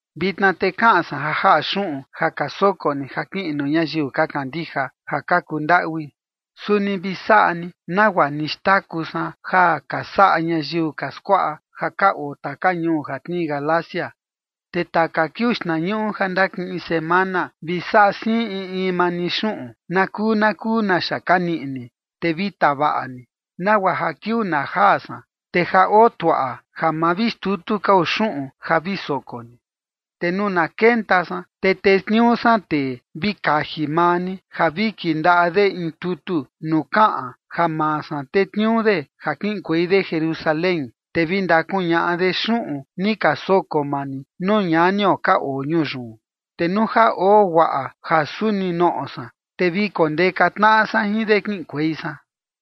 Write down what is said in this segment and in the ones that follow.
Vitna te kaꞌan san ja jaꞌa xuꞌun ja ka soko ni ja kiꞌin nuu ñayiu ka kandija ja ka kuu ndaꞌui. Suni vi saꞌa ni nagua ni xtaku san ja ka saꞌa ñayiu ka skuaꞌa ja ka oo taka ñuu ja tnii Galacia. Te taka kiuu xtnañuꞌu ja ndakiꞌin semana, vi saꞌa siin in in maa ni xuꞌun na kuu na kuu naxa ka niꞌi ni, te vi tavaꞌa ni, nagua ja kiuu na jaa san, te ja otuaꞌa, ja ma vi xtutu kao xuꞌun ja vi soko ni. Te nuu na kenta san, te tetniuu san tee vi kaji maa ni ja vi kindaꞌa de in tutu nuu kaꞌan ja maa san tetniuu de ja kiꞌinkuei de Jerusalén, te vi ndakuñaꞌa de xuꞌun ni ka soko maa ni nuu ñanio ka oo ñuu yun. Te nuu ja oo guaꞌa ja suni noꞌo san, te vi kondeka tnaꞌa san jin de kiꞌinkuei san.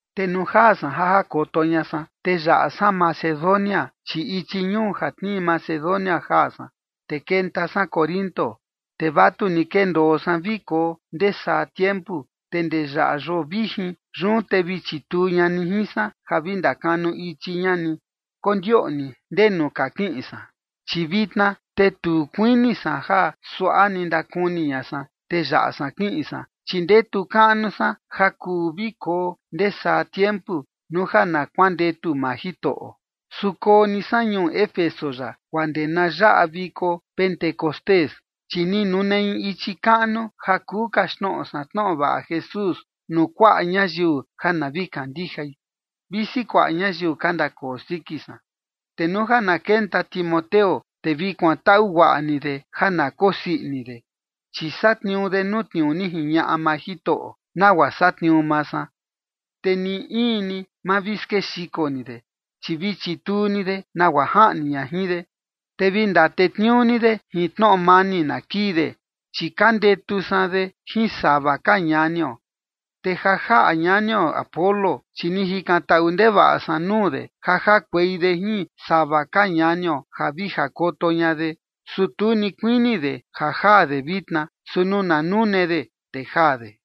Te nuu jaa san ja jakoto ña san, te yaꞌa san Macedonia, chi ichi ñuu ja tnii Macedonia jaa san, te kenta san Corinto. Te vatuni kendoo san vi koo ndee saa tiempu, te ndee yaꞌa yoo vijin. Yun te vi chituu ña ni jin san ja vi ndakanu ichi ña ni, kondioꞌni ndenu ka kiꞌin san. Chi vitna te tu kuini san ja suaꞌa ni ndakuni ña san, te yaꞌa san kiꞌin san, chi ndetu kaꞌnu san ja kuu vi koo ndee saa tiempu, nuu ja na kuandetu maa Jitoꞌo. Su koo ni san ñuu Éfeso yaꞌa guaa ndee na yaꞌa viko Pentecostés. Chi ni nune in ichi kaꞌnu ja kuu kaxtnoꞌo san tnoꞌo vaꞌa Jesús nuu kuaꞌa ñayiu ja na vi kandijai, visi kuaꞌa ñayiu ka ndakoo siki san. Te nuu ja na kenta Timoteo, te vi kuantaꞌu guaꞌa ni de ja na kosii ini de, chi satniuu de nuu tniuu ni jiñaꞌa maa Jitoꞌo, nagua satniuu maa san. Te ni in ni ma vi skexiko ni de, chi vi chituu ni de nagua jaꞌni ña jin de, te vi ndatetniuu ni de jin tnoꞌo mani na kii de, chi ka ndetu san de jin sava ka ñanio. Te ja jaꞌa ñanio Apolos, chi ni jikantaꞌu ndevaꞌa san nuu de ja jakuei de jin sava ka ñanio ja vi jakoto ña de. Su tu ni kuini de ja jaa de vitna, su nuu na nune de, te jaa de.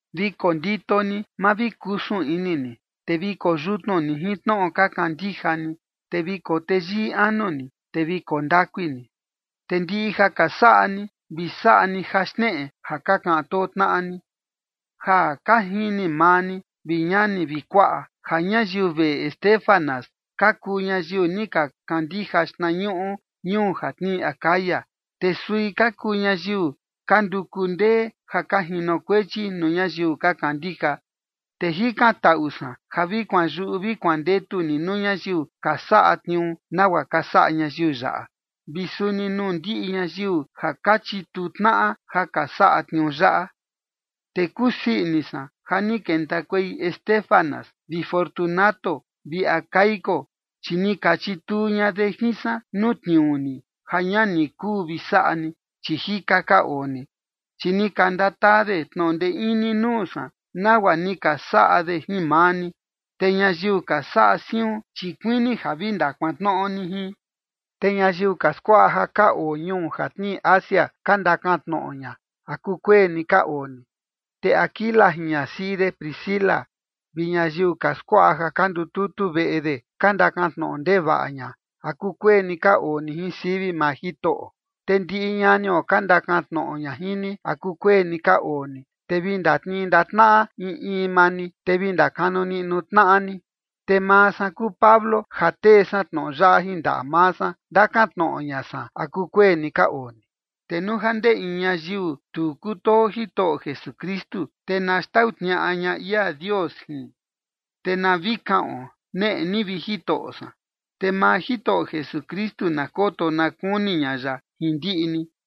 Vi kondito ni, ma vi kusun ini ni, te vi koo yutnu ni jin tnoꞌo ka kandija ni, vi koo teyii anu ni, te vi koo ndakui ni. Te ndiꞌi ja ka saꞌa ni, vi saꞌa ni ja xneꞌe ja ka kaꞌan too tnaꞌa ni. Ja ka jini maa ni, vi ñani vi kuaꞌa, ja ñayiu veꞌe Estéfanas ka kuu ñayiu ni ka kandija xtnañuꞌu ñuu ja tnii Acaya, te sui ka kuu ñayiu ka nduku ndee ja ka jinokuechi nuu ñayiu ka kandija. Te jikantaꞌu san ja vi kuanyuꞌu vi kuandetu ni nuu ñayiu ka saꞌa tniuu nagua ka saꞌa ñayiu yaꞌa, vi suni nuu ndiꞌi ñayiu ja ka chituu tnaꞌa ja ka saꞌa tniuu yaꞌa. Te kusii ini san ja ni kentakuei Estéfanas vi Fortunato vi Acaico, chi ni ka chituu ña de jin san nuu tniuu ni, ja ña ni kuu vi saꞌa ni, chi jika ka oo ni. Chi ni ka ndataa de tnoꞌo ndee ini nuu san, nagua ni ka saꞌa de jin maa ni. Te ñayiu ka saꞌa siun, chi kuini ja vi ndakuantnoꞌo ni jin. Te ñayiu ka skuaꞌa ja ka oo ñuu ja tnii Asia ka ndakan tnoꞌo ña, ¿a kukueni ka oo ni? Te Aquila jin ñasiꞌi de Priscila vi ñayiu ka skuaꞌa ja ka ndututu veꞌe de ka ndakan tnoꞌo ndevaꞌa ña, ¿a kukueni ka oo ni jin sivi maa Jitoꞌo? Te ndiꞌi ñanio ka ndakan tnoꞌo ña jin ni, ¿a kukueni ka oo ni? Te vi ndatnii ndaꞌa tnaꞌa in in maa ni, te vi ndakanu niꞌnu tnaꞌa ni. Te maa san kuu Pablo ja tee san tnoꞌo yaꞌa jin ndaꞌa maa san, ndakan tnoꞌo ña san, ¿a kukueni ka oo ni? Te nuu ja ndee in ñayiu tu kutoo Jitoꞌo Jesukristu, te na xtau tniaꞌa ña ia Dios jin. Te na vi kaꞌon: “Neꞌe ni, vi Jitoꞌo san”. Te maa Jitoꞌo Jesukristu na koto na kuni ña ya jin ndiꞌi ni.